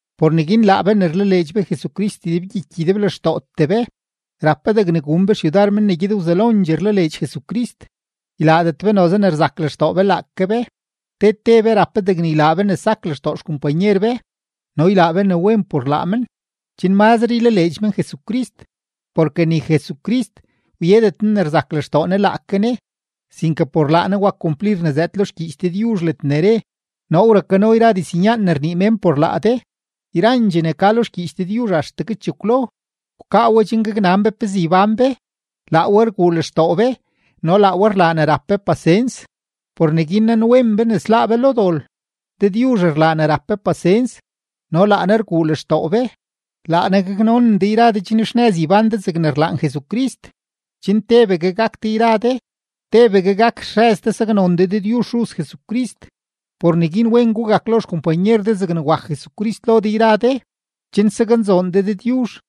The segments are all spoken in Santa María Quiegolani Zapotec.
Por neguin laa be ne rlaleedx be Jesucrist ydebgyiky ydeblextootee be, rap be degne gun be xyudar men ne gyed wzelondxee rlaleedx Jesucrist; ylaadet be noze ne rzak lextoo be laake be. Te te be rap be degne ylaa be logne sak lextoo xkompanyer be no ylaa be ne wen por laa men, chen mazre ylaleedx men Jesucrist. Porke ni Jesucrist wyedet Ne ne nzak lextoo Ne laake Ne, sinke por laa Ne wak kumplir ne zëëd lo xgyiich Dëdyuzh ledne re: “Noo wrukano yra diznyaan ne rnii mén por laa de.” Yrandxee ne ka lo xgyiich Dëdyuzh axtegue chekwlo, wkaa we chen gaknan be pezee ybán be; laa we rguu lextoo be no laa we rlaa ne rap be pasens, por neguin nanwen be ne sláá be lo dol. Dëdyuzh rlaa ne rap be pasens no laa Ne rguu lextoo be, laa Ne gaknonen de yra de chen xnëz ybán de zegne rlaan Jesucrist, chen tebegue gak de yra de, tebegue gak xrëz de saknon de Dëdyuzh Xuz Jesucrist. Por neguin wen gugak lo xkompanyer de zegne wak Jesucrist lo de yra de, chen saknzoon de Dëdyuzh.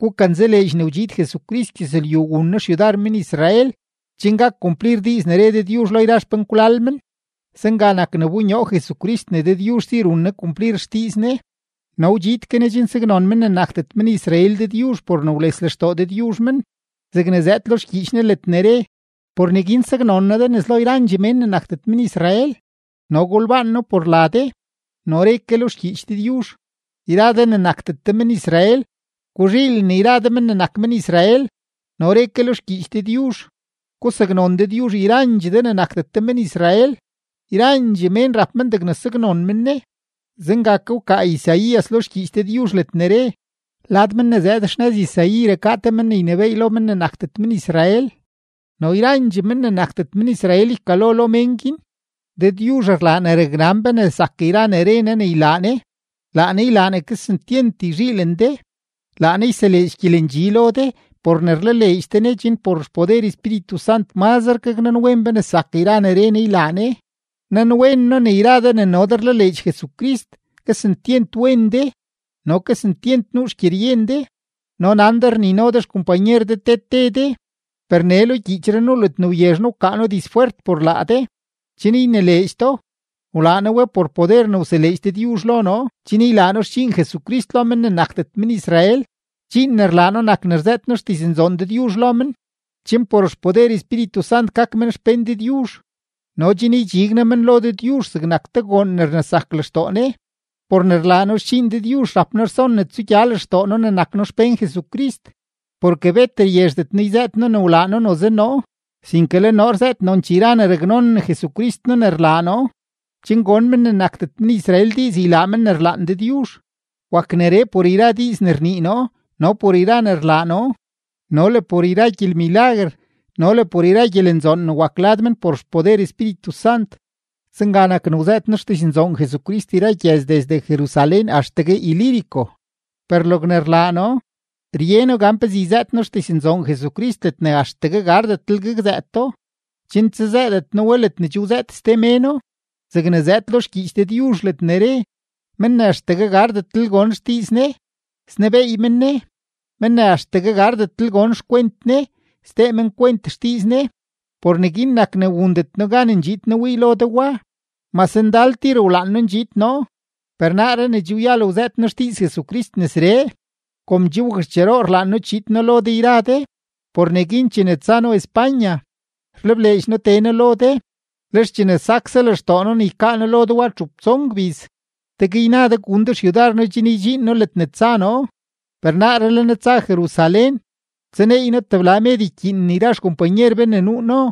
Gukanzaleedx ne wdxiid Jesucrist gyëzlyu wun Ne xyudar men-Israel, chen gak kumplir diiz ne re Dëdyuzh lo yra xpenkwlal men, zenga nak ne wbonyoo Jesucrist ne Dëdyuzh si run Ne kumplir xdiiz Ne, no wdxiid ke Ne chen saknon men ne nakdet men-Israel Dëdyuzh por ne wles lextoo Dëdyuzh men, zegne zëëd lo xgyiich Ne ledne re: Por neguin saknon noo de nes lo yrandxee mén ne nakdet men-Israel no golbaan noo por la de. No re ke lo xgyiich Dëdyuzh: Yra de ne nakdet de men-Israel, guzhiilen yra de men ne nak men-Israel. No le re ke lo xgyiich Dëdyuzh: Gusaknon Dëdyuzh yrandxee de ne nakdet de men-Israel, yrandxee mén rap men degne saknon men Ne. Zenga ke wkaa Isaías lo xgyiich Dëdyuzh ledne re: Lad men ne zëëd xnëz Isaí yrukaa te men ne ynebééy lo men ne nakdet men-Israel, no yrandxee men ne nakdet men-Israel ykalo lo men guin. Dëdyuzh rlaa ne raknan be ne zak yra ne re Ne ne ylaa Ne, laa Ne ylaa ne kesentyent yzhiilen de, laa Ne yseleedx gyelendxi lo de por ne rlaleedx de Ne chen por xpoder Espíritu Sant mazre gaknanwen be ne zak yra ne re Ne ne ylaa Ne. Nanwen noo ne yra de ne no de rlaleedx Jesucrist, kesentyent wen de, no kesentyent nuu xgyeryen de, no nan de rnino de xkompanyer de te te de. Per nee lo gyiichree nuu ledne wyezh noo wkaa noo dizfwert por laa de, chen ynileedx do, wlaa noo we por poder ne wseleedx Dëdyuzh lo noo chen ylaa noo xdxiin Jesucrist lo men ne nakdet men-Israel. Dxiin ne rlaa noo nak ne rzëët noo xdiznzoon Dëdyuzh lo men, chen por xpoder Espíritu Sant gak men xpén Dëdyuzh no chen ychig noo men lo Dëdyuzh zegnak te goon ne rnesak lextoo Ne. Por ne rlaa noo xdxiin Dëdyuzh, rap noo rson ne tsugya lextoo noo ne nak noo xpén Jesucrist. Porke bet ryezhdet noo yzëët noo ne wlaa noo noze noo, sinke le noo rzëët nonchee yra ne raknonen Jesucrist noo ne rlaa noo chen gon men ne nakdet men-Israel diiz ylaa men ne rlaan Dëdyuzh; wak neree por yra diiz ne rnii noo no por yra ne rlaa noo, no le por yra gyelmilaguer no le por yra gyelenzoon ne wak lad men por xpoder Espíritu Sant. Zenga nak ne wzëët noo xdiznzoon Jesucrist yra gyëz desde Jerusalén axtegue Ilírico. Per logne rlaa noo, rye noo gan pezee yzëët noo xdiznzoon Jesucrist ledne axtegue gardetlel gakzëëto, chen tsazëëdet noo we ledne che wzëët ste méno. Zegne zëëd lo xgyiich Dëdyuzh ledne re: Men ne axtegue gardetlel gon xdiiz Ne, snebeey men Ne. Men ne axtegue gardetlel gon xkwent Ne, sdee men kwent xdiiz Ne. Por neguin nak ne wundet noo gan ndxiid noo wii lo de wa, mase ndal tir wlaan noo ndxiid noo. Per naaree ne che wyal wzëët noo xdiiz Jesucrist nesree, kom che wakxcheroo rlaan noo chiid noo lo de yra de, por neguin chene tsa noo España, rlebleedx noo tee noo lo de; lex chene sakse lextoo noo ne ykaa noo lo de wa txup tson gbiz, tegue yna de gun de xyudar noo chen ydxiin noo ledne tsa noo. Per naaree le noo tsa Jerusalén, tsaneey noo tebla med ykyiinen yra xkompanyer be ne nuu no.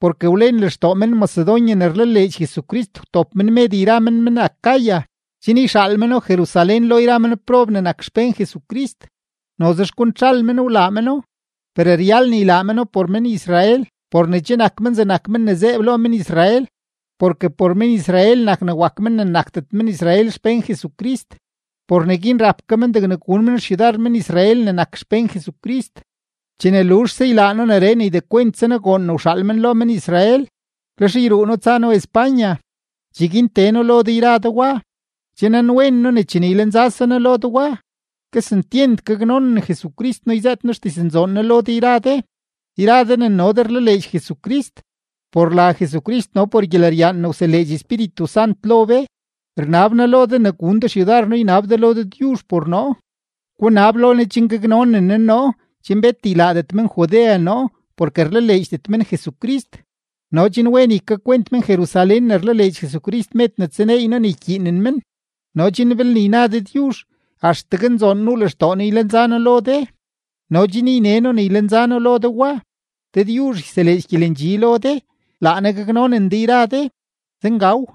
Porke wlen lextoo men-Macedonia ne rlaleedx Jesucrist wtop men med yra men men-Acaya, chen yxaal meno Jerusalén lo yra menprob ne nak xpén Jesucrist. Noze xkwent zhal men wlaa meno, per ryal ne ylaa meno por men-Israel por ne che nak men zegnak men ne zeeb lo men-Israel; porke por men-Israel nak ne wak men ne nakdet men-Israel xpén Jesucrist, por neguin rap ke men degne gun men xyudar men-Israel ne nak xpén Jesucrist. Chene luzhse ylaa noo neree ne ydekwentse noo goon ne wxaal men lo men-Israel, lex yruu noo tsa noo España, cheguin tee noo lo de yra de wa. Che nanwen noo ne chene ylenzase noo lo de wa, kesentyent gaknonen Jesucrist noo yzëët noo xdiznzoon Ne lo de yra de. Yra de ne no de rlaleedx Jesucrist, por la Jesucrist no por gyeleryaan ne wseleedx Espíritu Sant lo be, rnab noo lo de ne gun de xyudar noo ynab de lo Dëdyuzh por noo; gunab lo Ne chen gaknonen Ne noo chen bet ylaadet men-Judea noo porke rlaleedxdet men Jesucrist, no chen wen ykakwent men-Jerusalén ne rlaleedx Jesucrist med ne tsaneey noo ne ykyiinen men, no chen belne yna Dëdyuzh axtegue nzoon nuu lextoo noo ylenza noo lo de, no chen yne noo ne ylenza noo lo de wa. Dëdyuzh yseleedx gyelendxi lo de, laa Ne gaknonen de yra de. Zengaw.